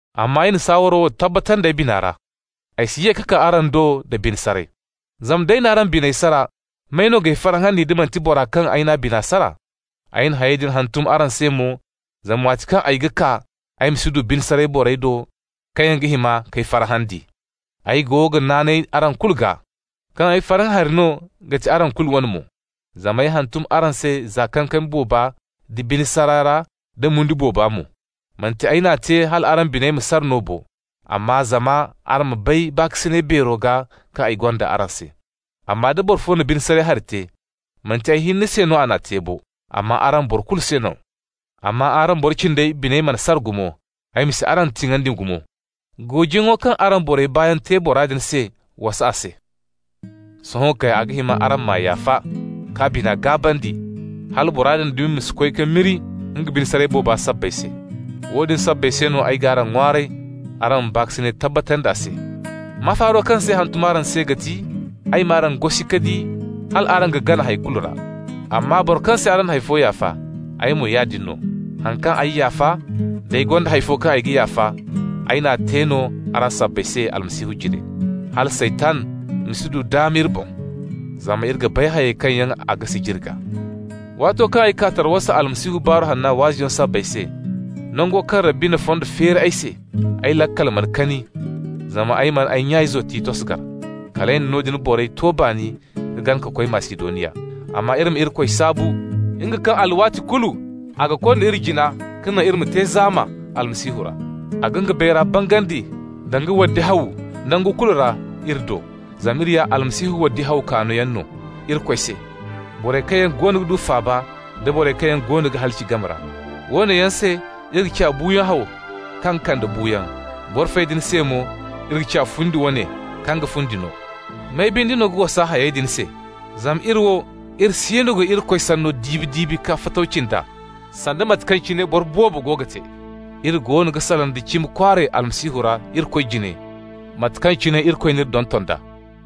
Amma ay na saawaro wo tabbatandi ay bina ra: ay si ye ka kaa araŋ do da bine saray. Zama nd'ay n'araŋ biney sara, may no g'ay farhandi, da manti bora kaŋ ay n'a bina sara? Ay na hayey din hantum araŋ se mo, zama waati kaŋ ay ga kaa, ay ma si du bine saray borey do kaŋ yaŋ ga hima k'ay farhandi. Ay go ga naanay araŋ kulu gaa kaŋ ay farhã hari no ga ti araŋ kulu wane mo. Zama ay hantum araŋ se za kankami booba da bine saray ra da mo-mundi boobo mo. Manti ay n'a te hal araŋ biney ma sara no bo, amma zama araŋ ma bay baakasinay beero gaa kaŋ ay gonda araŋ se. Amma da boro fo na bine saray hari te, manti ay hinne se no a n'a te bo, amma araŋ bora kulu se no -- amma araŋ boro cindey biney mana sara gumo (ay ma si araŋ tiŋandi gumo). Goojiyaŋo kaŋ araŋ borey baayaŋ te bora din se wasa a se. Sohõ kay a ga hima araŋ m'a yaafa, k'a bina gaabandi, hala bora din dumi ma si koy ka miri nga bine saray booba sabbay se. Woodin sabbay se no ay g'araŋ ŋwaaray araŋ ma baakasinay tabbatandi a se. Mafaaro kaŋ se ay hantum araŋ se ga ti: ay m'araŋ gosi ka di hal araŋ ga gana hay kulu ra. Amma boro kaŋ se araŋ na hay fo yaafa, ay mo yaadin no. Haŋ kaŋ ay yaafa -- d'ay gonda hay fo kaŋ ay ga yaafa -- ay n'a te no araŋ sabbay se Almasihu jine, hala Saytan ma si du daama iri boŋ. Zama iri ga bay hayey kaŋ yaŋ a ga sijiri gaa. Waato kaŋ ay kaa Tarawasa Almasihu Baaru Hanna waazuyaŋo sabbay se, nango kaŋ Rabbi na fondo feeri ay se, ay laakal mana kani, zama ay mana ay nya-izo Titos gar. Kal ay na noodin borey to baani ka gana ka koy Masidoniya. Amma iri ma Irikoy saabu, nga kaŋ alwaati kulu a ga konda iri jina ka naŋ iri ma te zaama Almasihu ra. A ga nga bayra bangandi danga waddi haw nangu kulu ra iri do. Zama iri ya Almasihu waddi haw kaanoyaŋ no Irikoy se, borey kaŋ yaŋ goono ga du faaba nda borey kaŋ yaŋ goono ga halaci game ra. Woone yaŋ se iri ga ciya buuyaŋ haw kaŋ ga kande buuyaŋ. Boro fey din se mo iri ga ciya fundi wane kaŋ ga fundi no. May binde no ga wasa hayey din se? Zama iri wo, iri siino ga Irikoy sanno diibi-diibi ka fatawci nd'a, sanda mate kaŋ cine boro boobo go ga te. Iri goono ga salaŋ da cimi kwaaray Almasihu ra Irikoy jine, mate kaŋ cine Irikoy n'iri donton d'a.